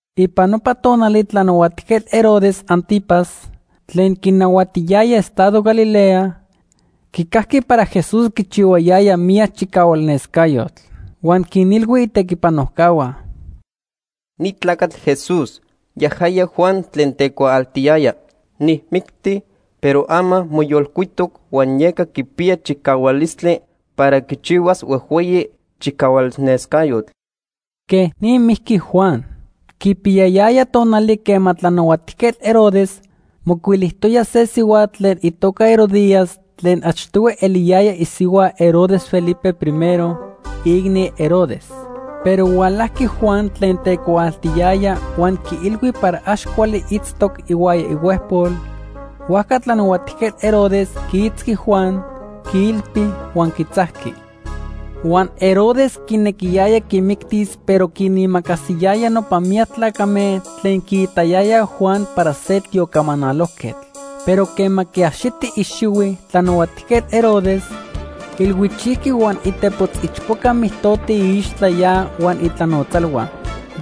Ipan nopa tonali Tlanahuatijquetl Herodes Ántipas tlen quinahuatiyaya estado Galilea quicajqui para Jesús quichihuayaya miyac chicahualnescayotl. Huan quinilhui itequipanojcahua: “Ni tlacatl Jesús, yajaya Juan tlen tecuaaltiyaya. Nijmicti, pero ama moyolcuitoc huan yeca quipiya chicahualistli para quichihuas huejhueyi chicahualnescayotl.” Quej ni mijqui Juan. Quipiyayaya tonali quema Tlanahuatijquetl Herodes mocuilijtoya se sihuatl tlen itoca Herodías tlen achtohui eliyaya isihua Herodes Felipe I, iicni Herodes. Pero hualajqui Juan tlen tecuaaltiyaya huan quiilhui para ax cuali itztoc ihuaya ihuejpol, huajca Tlanahuatijquetl Herodes quiitzqui Juan, quiilpi huan quitzajqui. Huan Herodes quinequiyaya quimictis pero quinimacasiyaya nopa miyac tlacame tlen quiitayayaj Juan para se tiocamanalojquetl. Pero quema quiaxiti ixihui Tlanahuatijquetl Herodes, ilhuichijqui huan itepotz ichpoca mijtotico iixtla ya huan itlanotzalhua.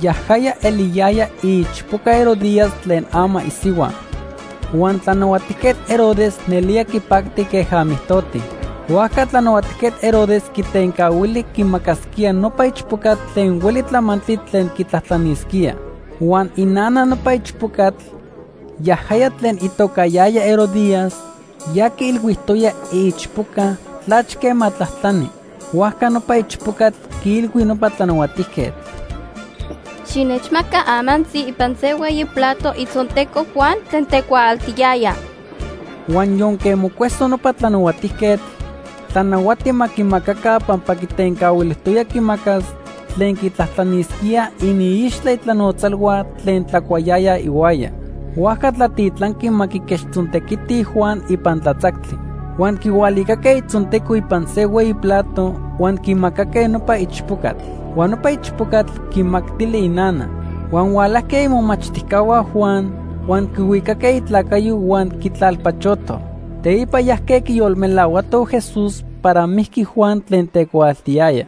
Yajaya eliyaya iichpoca Herodías tlen ama isihua. Huan Tlanahuatijquetl Herodes nelía quipacti queja mijtoti. Huajca Tlanahuatijquetl Herodes quitencahuili quimacasquía nopa ichpocatl tlen hueli tlamantli tlen quitlajtlanisquía. Huan inana nopa ichpocatl, yajaya tlen itocayaya Herodías, ya quiilhuijtoya iichpoca tlachque ma tlajtlani. Huajca nopa ichpocatl quiilhui nopa tlanahuatijquetl: ―Xinechmaca amantzi ipan se hueyi plato itzonteco Juan tlen tecuaaltiyaya. Huan yonque mocueso nopa tlanahuatijquetl, tlanahuati ma quimacaca pampa quitencahuilijtoya quimacas tlen quitlajtlanisquía iniixtla itlanotzalhua tlen tlacuayayaj ihuaya. Huajca tlatitlanqui ma quiquechtzontequiti Juan ipan tlatzactli. Huan quihualicaque itzonteco ipan se hueyi plato huan quimacaque nopa ichpocatl. Huan nopa ichpocatl quimactili inana. Huan hualajque imomachtijcahua Juan huan quihuicaque itlacayo huan quitlalpachotoj. Teipa yajque quiyolmelahuatoj Jesús para mijqui Juan tlen tecuaaltiyaya.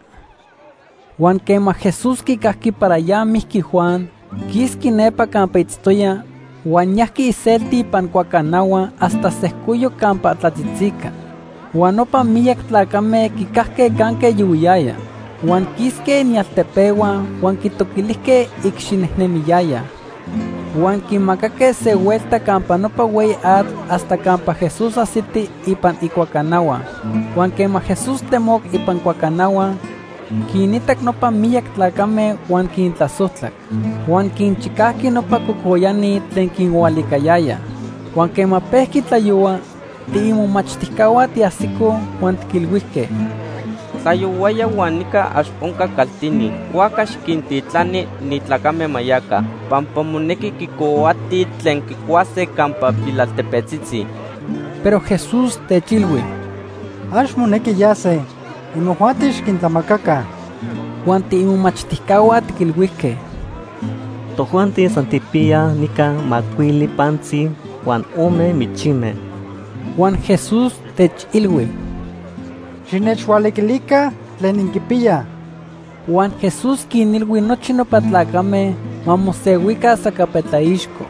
Huan quema Jesús quicajqui para ya mijqui Juan, quisqui nepa campa itztoya, huan yajqui iselti ipan cuacanahua hasta sejcoyoc campa tlatzitzica. Huan nopa miyac tlacame quicajque canque yohuiyaya. Huan quisque inialtepehua huan quitoquilijque icxinejnemiyayaj. Huan quimacaque se huelta campa nopa hueyi atl hasta campa Jesús ajsiti ipan icuacanahua. Huan quema Jesús temoc ipan cuacanahua, quinitac nopa miyac tlacame huan quintlasojtlac. Huan quinchicajqui nopa cocoyani tlen quinhualiquiliyayaj. Huan quema pejqui tlayohua, tiimomachtijcahua tiajsicoj huan tiquilhuijque: ―Tlayohuaya huan nica ax onca caltini. Huajca xiquintitlani ni tlacame ma yaca, pampa monequi quicohuatij tlen quicuase campa pilaltepetzitzi. Pero Jesús techilhui: ―Ax monequi yase. Imojuanti xiquintlamacaca. Huan tiimomachtijcahua tiquilhuijque: ―Tojuanti san tijpiyaj nica macuili pantzi huan ome michime. Huan Jesús techilhui: ―Xinechhualiquilica tlen inquipiyaj. Huan Jesús quinilhui nochi nopa tlacame ma mosehuica sacapetlaixco.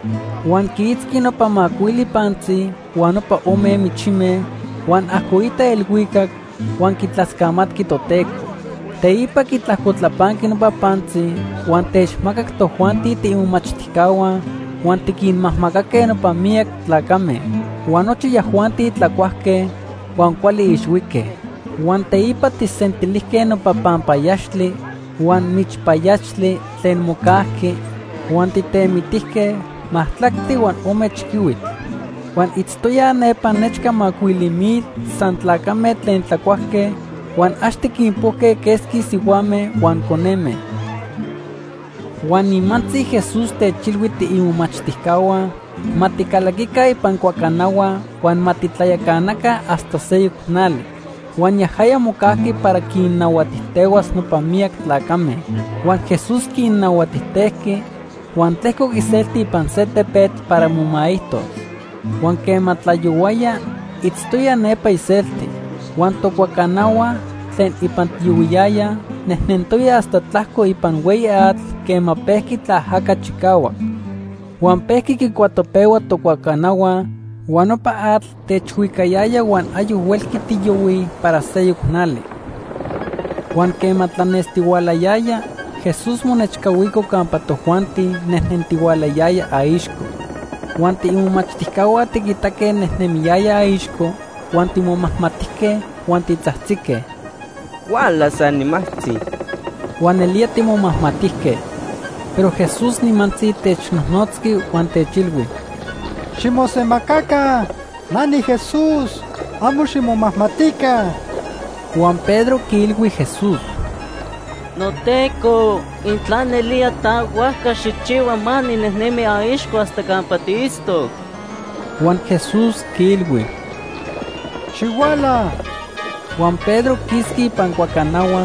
Huan quiitzqui nopa macuili pantzi huan nopa ome michime, huan ajcoitac elhuicac, huan quitlascamatqui Toteco. Teipa quitlajcotlapanqui nopa pantzi huan techmacac tojuanti tiimomachtijcahua huan tiquinmajmacaque nopa miyac tlacame. Huan nochi yajuanti tlacuajque huan cuali ixhuique. Huan teipa tijsentilijque nopa panpayaxtli huan michpayaxtli tlen mocajqui, huan tijtemitijque majtlactli huan ome chiquihuitl. Huan itztoyaj nepa nechca macuili mil san tlacame tlen tlacuajque huan ax tiquinpojque quesqui sihuame huan coneme. Huan nimantzi Jesús techilhui tiimomachtijcahua ma ticalaquica ipan cuacanahua huan ma titlayacanaca hasta seyoc nali. Huan yajaya mocajqui para quinnahuatijtehuas nopa miyac tlacame. Huan Jesús quinnahuatijtejqui huan tlejcoc iselti ipan se tepetl para momaijtos. Huan quema tlayohuaya, itztoya nepa iselti. Huan tocuacanahua tlen ipan tiyohuiyayaj nejnentoya hasta tlajco ipan hueyi atl quema pejqui tlaajaca chicahuac. Huan pejqui quicuatopehua tocuacanahua, huan nopa atl techhuicayaya huan ayoc huelqui tiyohuij para seyoc nali. Huan quema tlanestihualayaya, Jesús monechcahuico campa tojuanti nejnentihualayaya aixco. Huan tiimomachtijcahua tiquitaque nejnemiyaya aixco, huan timomajmatijque huan titzajtzique: ―Huala se animajtzi. Huan nelía timomajmatijque. Pero Jesús nimantzi technojnotzqui huan techilhui: ―Ximosemacaca. Na niJesús. Amo ximomajmatica. Huan Pedro quiilhui Jesús: ―NoTeco, intla nelía ta, huajca xijchihua ma ninejnemi aixco hasta campa tiitztoc. Huan Jesús quiilhui: ―Xihuala. Huan Pedro quisqui ipan cuacanahua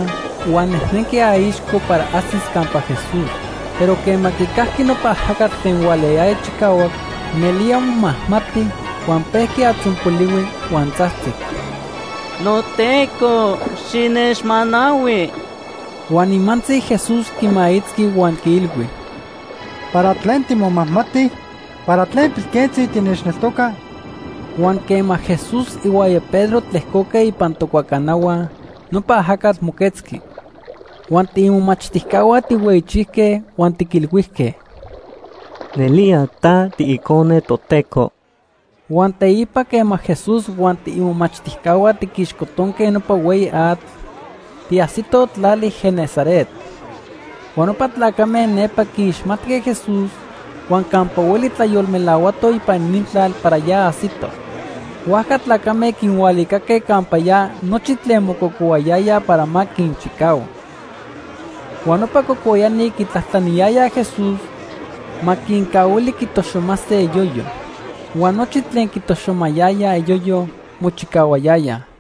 huan nejnenqui aixco para ajsis campa Jesús. Pero quema quicajqui nopa ajacatl tlen hualayaya chicahuac, nelía momajmati huan pejqui atzonpolihui, huan tzajtzic: ―NoTeco xinechmanahui. Huan nimantzi Jesús quimaitzqui huan quiilhui: ―¿Para tlen timomajmati? ¿Para tlen pilquentzi tinechneltoca? Huan quema Jesús ihuaya Pedro tlejcoque ipan tocuacanahua, nopa ajacatl moquetzqui. Huan tiimomachtijcahua tijhueyichijque huan tiquilhuijque: ―Nelía ta tiIcone Toteco. Huan teipa quema Jesús huan tiimomachtijcahua tiquixcotonque nopa hueyi atl, tiajsitoj tlali Genesaret. Huan nopa tlacame nepa quiixmatque Jesús huan campa hueli tlayolmelahuatoj ipan inintlal para ya ajsito. Huajca tlacame quinhualicaque campa ya nochi tlen mococohuayayaj para ma quinchicahua. Huan nopa cocoyani quitlajtlaniyayaj Jesús ma quincahuili quitoxomase iyoyo. Huan nochi tlen quitoxomayayaj iyoyo, mochicahuayayaj.